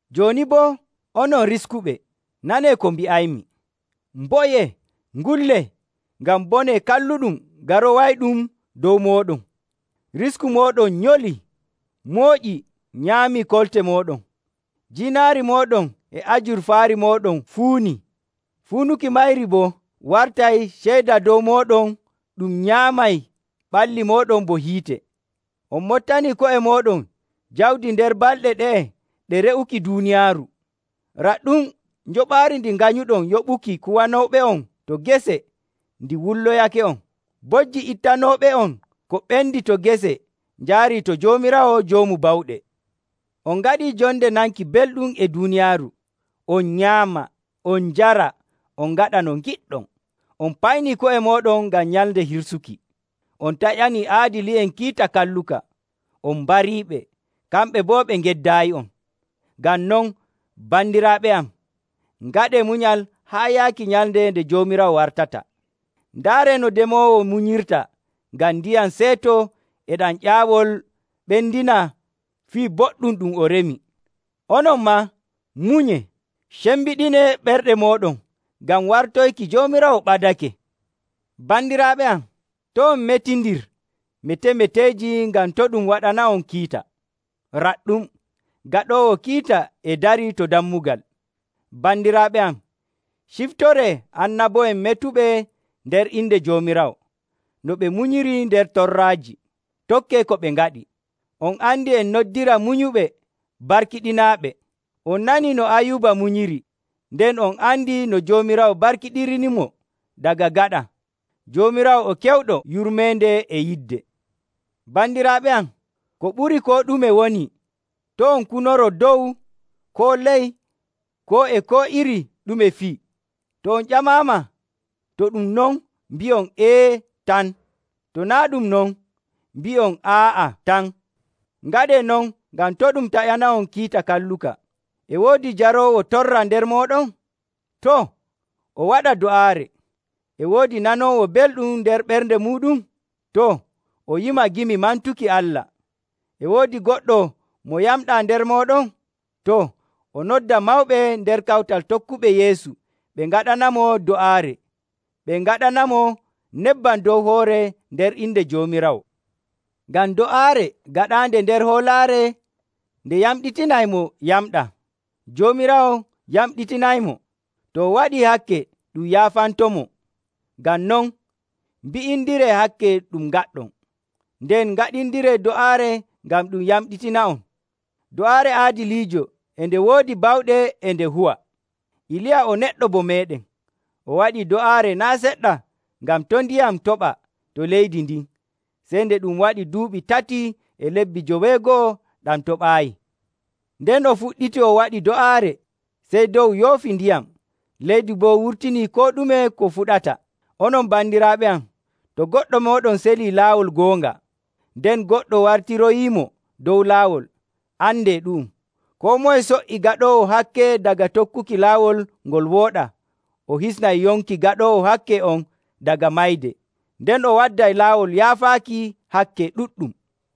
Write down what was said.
Jooni boo, onon riskuɓe, nanee ko mbi'aymi! Mboyee, ngullee ngam bone kalluɗum garowayɗum dow mooɗon. Risku mooɗon nyolii, mooƴi nyaamii kolte mooɗon. Jiinaari mooɗon e ajurfaari mooɗon fuunii, fuunuki mayri boo wartay ceyda dow mooɗon ɗum nyaamay ɓalli mooɗon bo hiite. On moɓtanii ko'e mooɗon jawdi nder balɗe ɗe'e ɗe re'uki duuniyaaru. Raɗɗum! Njoɓaari ndi nganyuɗon yoɓuki kuwanooɓe'on to gese ndi wulloyake'on. Bojji ittanooɓe'on ko ɓendi to gese njaarii to Joomiraawo Joomu Bawɗe. On ngaɗii jonde nanki belɗum e duuniyaaru, on nyaama, on njara, on ngaɗa no ngiɗɗon. On paynii ko'e mooɗon ngam nyalnde hirsuki. On taƴanii aadili'en kiita kalluka, on mbariiɓe, kamɓe boo ɓe ngeddaayi'on. Ngam non, bandiraaɓe am, ngaɗee munyal haa yaaki nyalnde nde Joomiraawo wartata. Ndaaree no demoowo munyirta ngam ndiyam seeto e ɗam ƴaawol ɓendina fii boɗɗum ɗum o remi. Onon maa, munyee. Cembiɗinee ɓerɗe mooɗon, ngam wartoyki Joomiraawo ɓadake. Bandiraaɓe am, to' on metindir metemeteeji ngam to ɗum waɗana'on kiita. Raɗɗum, Gaɗoowo Kiita e darii to dammugal! Bandiraaɓe am, ciftoree annabo'en metuɓe nder inde Joomiraawo, no ɓe munyiri nder torraaji. Tokkee ko ɓe ngaɗi. On andi, en noddira munyuɓe barkiɗinaaɓe. On nanii no Ayuuba munyiri, nden on andi no Joomiraawo barkiɗinirimo daga gaɗa. Joomiraawo o kewɗo yurmeende e yidde. Bandiraaɓe am, ko ɓuri koo ɗume woni to' on kunoro dow, koo ley, koo e koo iri ɗume fii. To on ƴamaama, to ɗum non, mbi'on “Ee” tan. To naa' ɗum non, mbi'on “Aa'a” tan. Ngaɗee non ngam to ɗum taƴana'on kiita kalluka. E woodi jaroowo torra nder mooɗon? Too, o waɗa do'aare. E woodi nanoowo belɗum nder ɓernde muuɗum? Too, o yima gimi mantuki Allah. E woodi goɗɗo mo yamɗaa nder mooɗon? Too, o nodda mawɓe nder kawtal tokkuɓe Yeesu, ɓe ngaɗanamo do'aare, ɓe ngaɗanamo nebbam dow hoore nder inde Joomiraawo. Ngam do'aare gaɗaande nder hoolaare nde yamɗitinay mo yamɗaa. Joomiraawo yamɗitinaymo. To o waɗii hakke, ɗum yaafantomo. Ngam non, mbi'indiree hakke ɗum ngaɗɗon, nden ngaɗindiree do'aare ngam ɗum yamɗitina'on. Do'aare aadiliijo e nde woodi bawɗe e nde huwa. Iliya o neɗɗo bo meeɗen. O waɗi do'aare naa' seɗɗa ngam to' ndiyam toɓa to leydi ndin, sey nde ɗum waɗi duuɓi tati e lebbi joweego'o ɗam toɓaayi. Nden o fuɗɗiti o waɗi do'aare, sey dow yoofi ndiyam, leydi boo wurtini koo ɗume ko fuɗata. Onon bandiraaɓe am, to goɗɗo mooɗon selii laawol goonga, nden goɗɗo wartiroyiimo dow laawol, andee ɗu'um: koo moye so''i gaɗoowo hakke daga tokkuki laawol ngol wooɗaa, o hisnay yonki gaɗoowo hakke on daga mayde, nden o wadday laawol yaafaaki hakke ɗuɗɗum.